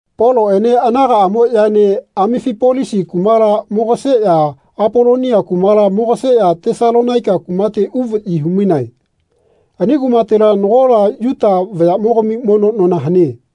Poloꞌene anagaꞌamoꞌyaene Amifipolisi kumala mogaseꞌya Apolonia kumala mogaseꞌya Tesalonaika kumate uvaꞌyi humainae. Ani kumatela nagola Yuta vayaꞌmogami mono nona hane.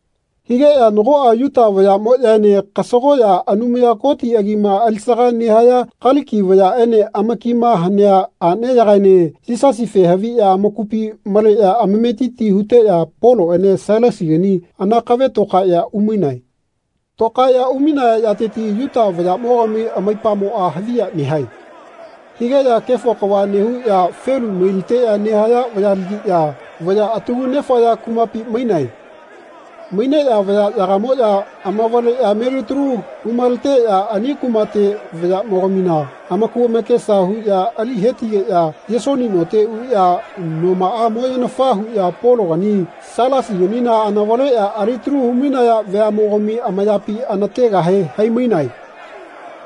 Higeꞌya nagoꞌa Yuta vayaꞌmoꞌyaene kasagoꞌya Anumaya Koti agima alisaga nehaya Kaliki vayaꞌene amakima hanea aꞌneyagaene Yisasife haviꞌya amakupi maleꞌya amametiti huteꞌya Poloꞌene Sailasigani anakave tokaeꞌya umainae. Tokaeꞌya umainaya yateti Yuta vayaꞌmogami amaipamoꞌa haviya nehae. Higeꞌya kefo kava nehuꞌya felu mailiteꞌya nehaya vayalagiꞌya vaya atagu nefaya kumapi mainae. Maineꞌya vayaꞌyaga amavaleꞌya melitalu humaleteꞌya ani kumate vayaꞌmogamina amaku amakesa huꞌya ali hetigeꞌya Yesoni note uꞌya nomaꞌa moyenafa huꞌya Pologani Sailasiganina anavaleꞌya alitalu humainaya veaꞌmogami amayapi anategahe haimainae.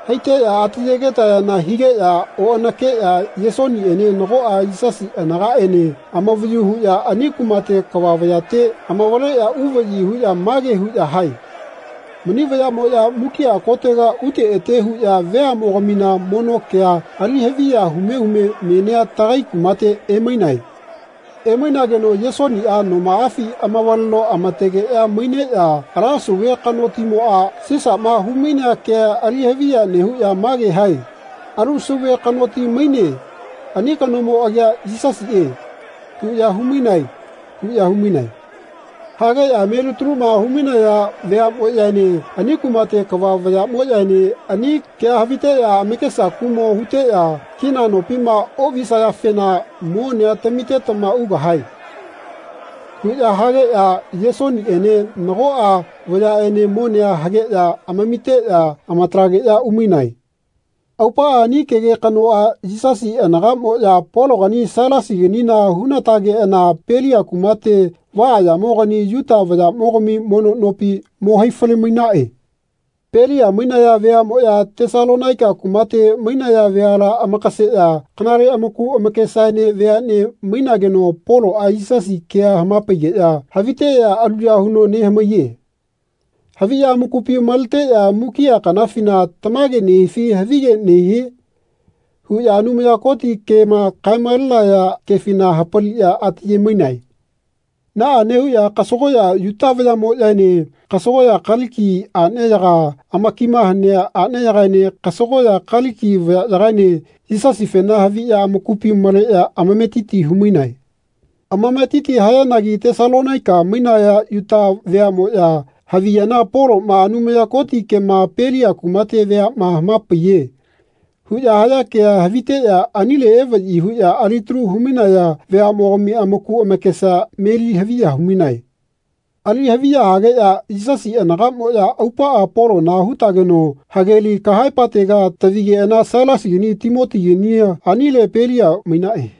Haiteꞌya atiyegetayana higeꞌya oꞌanakeꞌya Yesoniꞌene nagoꞌa Yisasi anagaꞌene amavayu huꞌya ani kumate kava vayate amavaleꞌya uvaꞌyi huꞌya mage huꞌya hae “Mani vayaꞌmoꞌya mukiꞌa kotega ute ete huꞌya veaꞌmogamina mono kea ali haviya hume hume menia tagai kumate emainae. Emainageno Yesoniꞌa nomaꞌafi amavaleno amategeꞌya maineꞌya ala sauve kanotimoꞌa, Sisaꞌma humainea kea ali haviya nehuꞌya mage hae ‘Alu sauve kanoti maine. Ani kanomo agia Yisasiꞌe.’ huꞌya humainae.” huꞌya humainae. Hageꞌya melitaluma humainaya veaꞌmoꞌyaene ani kumate kava vayaꞌmoꞌyaene ani kea haviteꞌya amakesa kuꞌmo huteꞌya “Kina nopima oꞌvisayafena monea tamitetama ugahae.” huꞌya hageꞌya Yesoniꞌene nagoꞌa vayaꞌene monea hageꞌya amamitageꞌya amatalageꞌya umainae. Aupaꞌa ani kege kanoꞌa Yisasi anagaꞌmoꞌya Pologani Sailasiganina hunatageꞌana Pelia kumate vaꞌaꞌyamogani Yuta vayaꞌmogami mono nopi mo haifale-mainaꞌe. Pelia mainaya veaꞌmoꞌya Tesalonaika kumate mainaya veala amakaseꞌya kanale amaku amakesaene veaꞌne mainageno Poloꞌa Yisasi kea hamapaigeꞌya haviteꞌya aluya huno nehamaiye. Haviꞌya amakupi maleteꞌya mukiꞌa kanafina “Tamage nehifi havige nehie?” huꞌya Anumaya Koti kema kae-malenaya kefina hapaliꞌya ati ayemainae. Naꞌa nehuꞌya kasagoꞌya Yuta vayaꞌmoꞌyaene kasagoꞌya Kaliki aꞌneyaga amakima hanea aꞌneyagaene kasagoꞌya Kaliki vayaꞌyagaene Yisasifena haviꞌya amakupi maleꞌya amametiti humainae. Amametiti hayanagi Tesalonaika mainaya Yuta veaꞌmoꞌya haviyana “Poloꞌma Anumaya Koti kema Pelia kumate veaꞌma hamapaiye.” huꞌya haya kea haviteꞌya anile evaꞌyi huꞌya alitalu humainaya veaꞌmogami amaku amakesa meli haviya humainae. Ali haviya hageꞌya Yisasi anagaꞌmoꞌya aupaꞌa Polona hutageno hageli kahaepatega tavigeꞌana Sailasigani Timotigania anile Pelia mainaꞌe.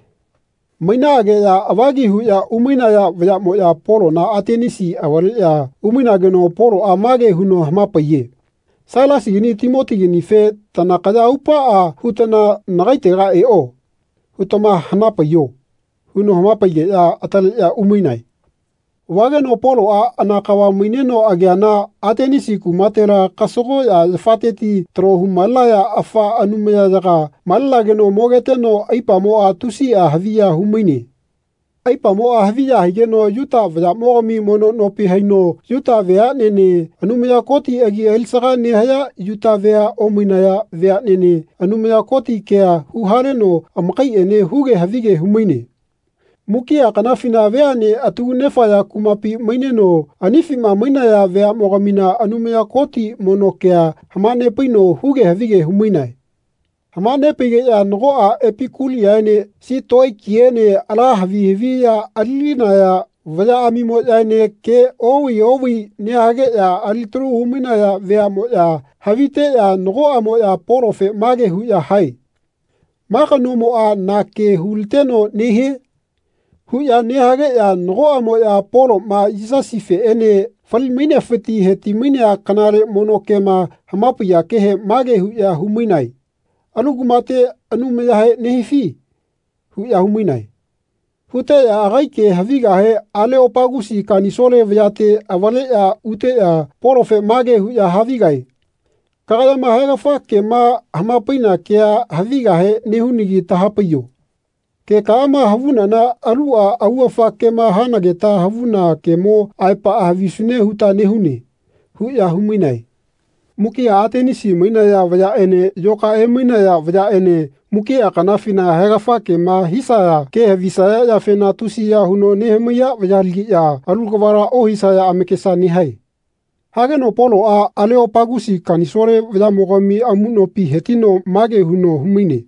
Mainaꞌageꞌya avagi huꞌya umainaya vayaꞌmoꞌya Polona Atenisi avaleꞌya umainageno Poloꞌa mage huno hamapaiye “Sailasigani Timotiganife ‘Tanakaya aupaꞌa hutana nagaitega eꞌo.’ hutama hanapaiho.” huno hamapaigeꞌya ataleꞌya umainae. Vageno Poloꞌa anakava maineno ageana Atenisi kumatela kasagoꞌya yafateti talo humalenaya afa anumayayaga malenageno mogeteno aipamoꞌa tusiꞌa haviya humaine. Aipamoꞌa haviya higeno Yuta vayaꞌmogami mono nopi haino Yuta veaꞌnene Anumaya Koti agi alisaga nehaya Yuta vea omainaya veaꞌnene Anumaya Koti kea huhaleno amakaiꞌene huge havige humaine. Mukiꞌa kanafina veaꞌne atagu nefaya kumapi maineno anifima mainaya veaꞌmogamina Anumaya Koti mono kea hamanepaino huge havige humainae. Hamanepaigeꞌya nagoꞌa Epikuliaene Sitoikiene ala havi haviꞌya alilinaya vayaꞌamimoꞌyaene ke oꞌvai oꞌvai nehageꞌya alitalu humainaya veaꞌmoꞌya haviteꞌya nagoꞌamoꞌya Polofe mage huꞌya hae “Ma kanomoꞌa na ke huliteno nehie?” huꞌya nehageꞌya nagoꞌamoꞌya Poloꞌma Yisasifeꞌene fali-mainefiti hetimainea kanale mono kema hamapaiya kehe mage huꞌya humainae “Alu kumate anumayahe nehifi?” huꞌya humainae. Huteꞌya agai ke havigahe Aleopagusi Kanisole vayate avaleꞌya uteꞌya Polofe mage huꞌya havigae “Kagayama haegafa kema hamapaina kea havigahe nehunagi tahapaiyo. Kekaꞌama havunana aluꞌa augafa kema hanageta havuna kemo aepaꞌa havisune huta nehune.” huꞌya humainae. Mukiꞌa Atenisi mainaya vayaꞌene yoka emainaya vayaꞌene mukiꞌa kanafina haegafa kema hisaya ke havisaya yafena tusiya huno nehamaiya vayalagiꞌya alu kavala ohisaya amakesa nehae. Hageno Poloꞌa Aleopagusi kanisole vayaꞌmogami amuꞌnopi hetino mage huno humaine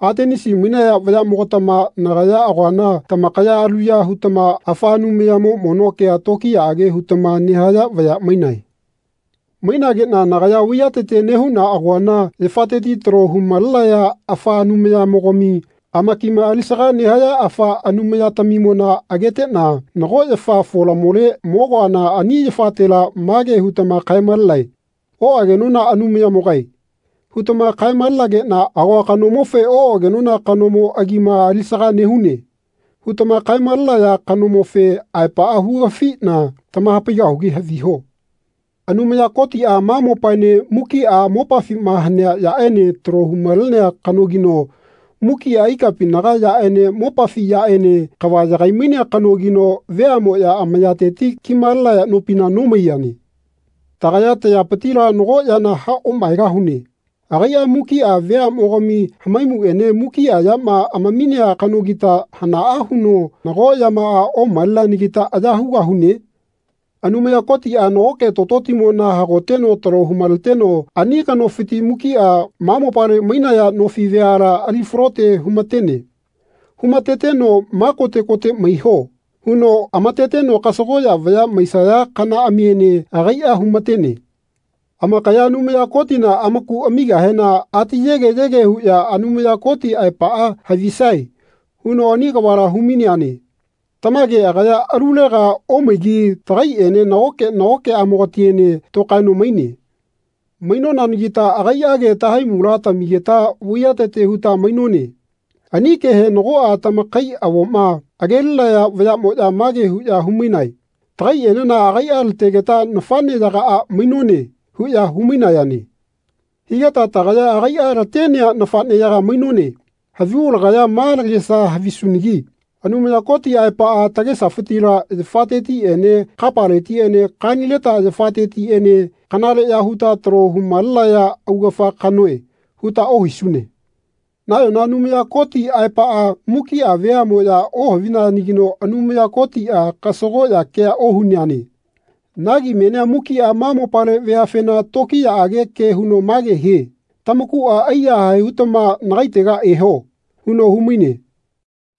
Atenisi mainaya vayaꞌmogatama nagaya agoana tamakaya aluya hutama afa anumayamo mono kea tokiyaꞌage hutama nehaya vaya mainae. Mainageꞌna nagaya vaiyatete nehuꞌna agoana yafateti talo humalenaya afa anumayamogami amakima alisaga nehaya afa anumayatamimona ageteꞌna nago yafa folamole mogoana ani yafatela mage hutama kae-malenae “Oꞌagenona anumayamogae.” hutama kae-malenageꞌna agoa kanomofe “Oꞌagenona kanomo agima alisaga nehune.” hutama kae-malenaya kanomofe aepaꞌa hugafiꞌna tamahapaigahugi haviho. Anumaya Kotiꞌa ma mopaene mukiꞌa mopafima hanea yaꞌene talo humalenea kanogino mukiꞌa ikapinaga yaꞌene mopafi yaꞌene kava yagai-mainea kanogino veaꞌmoꞌya amayateti kimalenaya nopina nomaiyane. Tagaya tayapitila nago yana haꞌomaegahune. Agaiꞌa mukiꞌa veaꞌmogami hamaimuꞌene mukiꞌa yama amaminea kanogita hanaꞌa huno nago yamaꞌa omaleneanagita aya hugahune? Anumaya Kotiꞌa nagoke tototimona hagoteno talo humaleteno ani kanofiti mukiꞌa ma mopale mainaya nofi veala ali falote humatene. Humateteno “Ma kote kote maiho.” huno amateteno kasagoꞌya vaya maisaya kanaꞌamiene agaiꞌa humatene. Amakaya Anumaya Kotina amaku amigahena ati yege yege huꞌya Anumaya Koti aepaꞌa havisae huno ani kavala humaineane. Tamage agaya alulega omaigi tagaiꞌene nagoke nagokeꞌmogatiene tokaeno maine. Maineanagita agaiꞌage tahaimula tamigeta vaiyatete huta mainone. Ani kehe nagoꞌa tamakai avoma agelinaya vayaꞌmoꞌya mage huꞌya humainae “Tagaiꞌenena agaiꞌa lategeta nafaꞌneyagaꞌa mainone.” huꞌya humainayane. Higeta tagaya agaiꞌa latenea nafaꞌneyaga mainone. Havigu lagaya ma lagesa havisunagi “Anumaya Koti aepaꞌa tagesafitila yafatetiꞌene kapaletiꞌene kanileta yafatetiꞌene kanaleꞌya huta talo humalenaya augafa kanoe.” huta ohisune. Nayona Anumaya Koti aepaꞌa mukiꞌa veaꞌmoꞌya ohavinayanagino Anumaya Kotiꞌa kasagoꞌya kea ohuneane. Nagi menia mukiꞌa ma mopale veafena tokiyaꞌage ke huno mage hie “Tamakuꞌa aiyahae hutama nagaitega eho.” huno humaine.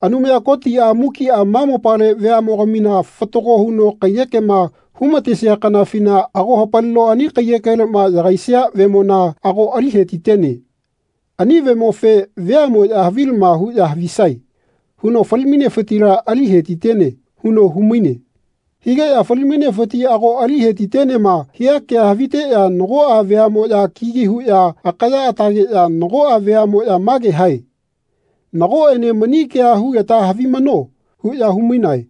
Anumaya Kotiꞌa mukiꞌa ma mopale veaꞌmogamina fatago huno kaiyekema humatesia kanafina ago hapalino ani kaiyekeleꞌma yagaisia vemona ago ali hetitene. Ani vemofe “Veaꞌmoꞌya havilama huꞌya havisae.” huno fali-mainefitila ali hetitene huno humaine. Higeꞌya “Fali-mainefiti ago ali hetitenema.” hia kea haviteꞌya nagoꞌa veaꞌmoꞌya kigi huꞌya akaya atageꞌya nagoꞌa veaꞌmoꞌya mage hae “Nagoꞌene mani kea hugeta havimano.” huꞌya humainae.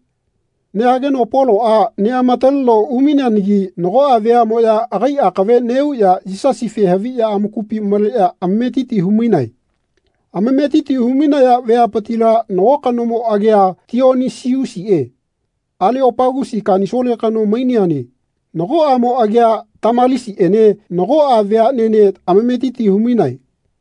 Nehageno Poloꞌa neꞌamataleno umaineanagi nagoꞌa veaꞌmoꞌya agai akave neꞌuꞌya Yisasife haviꞌya amakupi maleꞌya amametiti hu-mainae. Amametiti humainaya veapitila nago kanomo agia Tionisiusiꞌe Aleopagusi kanisole kano maineane. Nago aꞌmo agia Tamalisiꞌene nagoꞌa veaꞌnene amametitia humainae.